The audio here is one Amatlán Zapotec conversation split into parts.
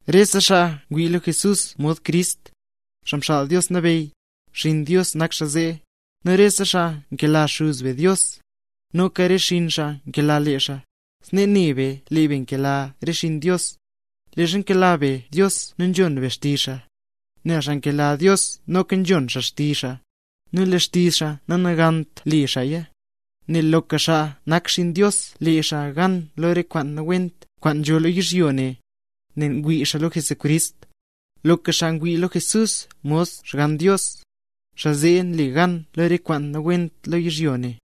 Rese xaa ngwii lo Jesús mod Crist, Xaa Mxaal Dios Nabeyy, xinn Dios nak xaa zee. Nu rese xaa nkela Xuz be Dios, noka re xinn xaa nkela lee xaa. Snee ne be lee be nkela re xinn Dios, leezha nkela be Dios nu nzhon be xtizh xaa, nel xaa nkela Dios noka nzhon xaa xtizh xaa. Nu lee xtizh xaa nanagant le xaaya, nel loka xaa nak xinn Dios le xaa gan lo re kwaan nawent kwaan nzho lo yizhyo ne, nel ngwii xaa lo Jesucrist. Loka xaa ngwii lo Jesús mod Xgann Dios, xaa zee nle gan lo re kwaan nawent lo yizhyo ne.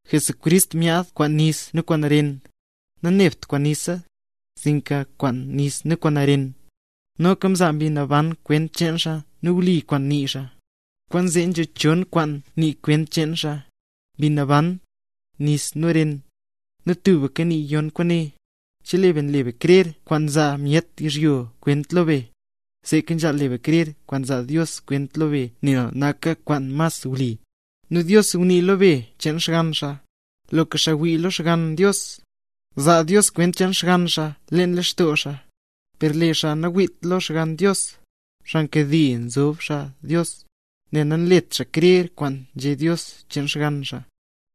Jesucrist myaad kwaan nis nu kwaan ren. Nanebt kwaan nisa, sinka kwaan nis nu kwaan ren. Noka mzaa Mbi Naban kwent cheen xaa nu wli kwaan nii xaa. Kwaanzee nzho chon kwaan nii kwent cheen xaa: Mbi Naban, nis, nu ren, nu tubka nii yon kwaane. Chelee be nle be krer kwaan nzaa myet yizhyo kwent lo be, seeka nzhaal le be krer kwaan nzaa Dios kwent lo be, nel naka kwaan mas wli. Nu Dios ngunii lo be cheen Xgann xaa. Loka xaa ngwii lo Xgann Dios, nzaa Dios kwent cheen Xgann xaa leen lextoo xaa. Per lee xaa nangwiit lo Xgann Dios, xaa nkade nzob xaa Dios, nel nanlet xaa krer kwaan nzhé Dios cheen Xgann xaa.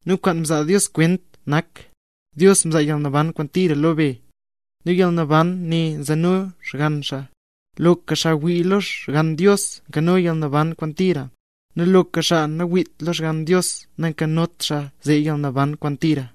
Nu kwaan nzaa Dios kwent nak: Dios mzaa yalnaban kwaan tira lo be, nu yalnaban ne nzeno Xgann xaa. Loka xaa ngwii lo Xgann Dios nkano yalnaban kwaan tira. Nu loka xaa nangwiit lo Xgann Dios nankanot xaa zee yalnaban kwaan tira.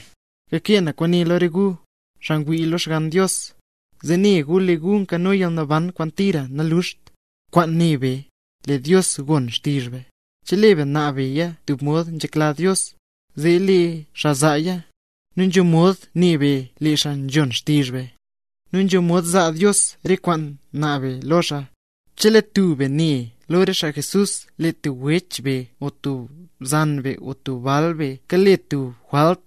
Kakee na kwaane lo re gu, xaa ngwii lo Xgann Dios, zee ne gu lee gu nkano yalnaban kwaan tira nanluxt. Kwaane ne be, lee Dios gon xtizh be. Chelee be naab beya tub mod nzhekla Dios, zee lee xaa zaaya. Nu nzho mod ne be lee xaa nzhon xtizh be, nu nzho mod zaa Dios re kwaan naab be lo xaa. Chelee tub be ne be lo re xaa Jesús, lee tub wech be o tub bzan be o tub bal be, kale tub jwalt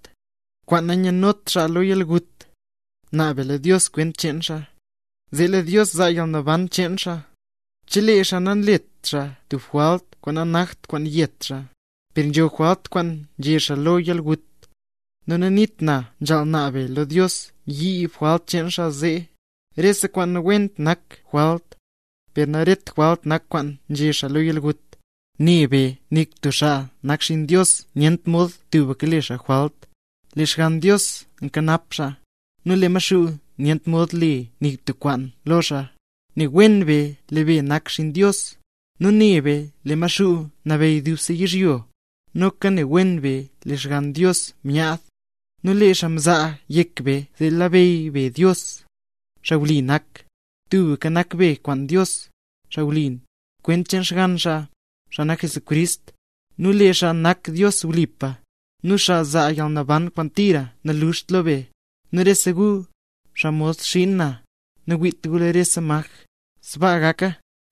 kwaan nanyanot xaa lo yalgut, naab be lo Dios kwent cheen xaa, zee lee Dios zaa yalnaban cheen xaa, chelee xaa nanlet xaa tub jwalt kwaan nanakt kwaan yet xaa. Per nzho jwalt kwaan nzhe xaa lo yalgut, nu naniit na nzhaal naab be lo Dios yiib jwalt cheen xaa zee. Rese kwaan nawent nak jwalt, per naret jwalt nak kwaan nzhe xaa lo yalgut. Ne be nik tub xaa nak xinn Dios nyent mod tubka nle xaa jwalt, nel Xgann Dios nkanap xaa, nu lee Maxuu nyent mod le nik tub kwaan lo xaa. Ne wen be lee be nak xinn Dios. Nu ne be lee Maxuu nabeyy dubse yizhyo. Noka ne wen be lee Xgann Dios myaad, nu lee xaa mzaa yek be zee labeyy be Dios, Xaa Wli nak. Tubka nak be kwaan Dios, Xaa Wli, kwent cheen Xgann xaa, xaa nak Jesucrist. Nu lee xaa nak Dios wlipa, nu xaa nzaa yalnaban kwaan tira nanluxt lo be. Rese gu, xaa mod xiin na, nawiit gu lo rese maj. Sbaa gaka.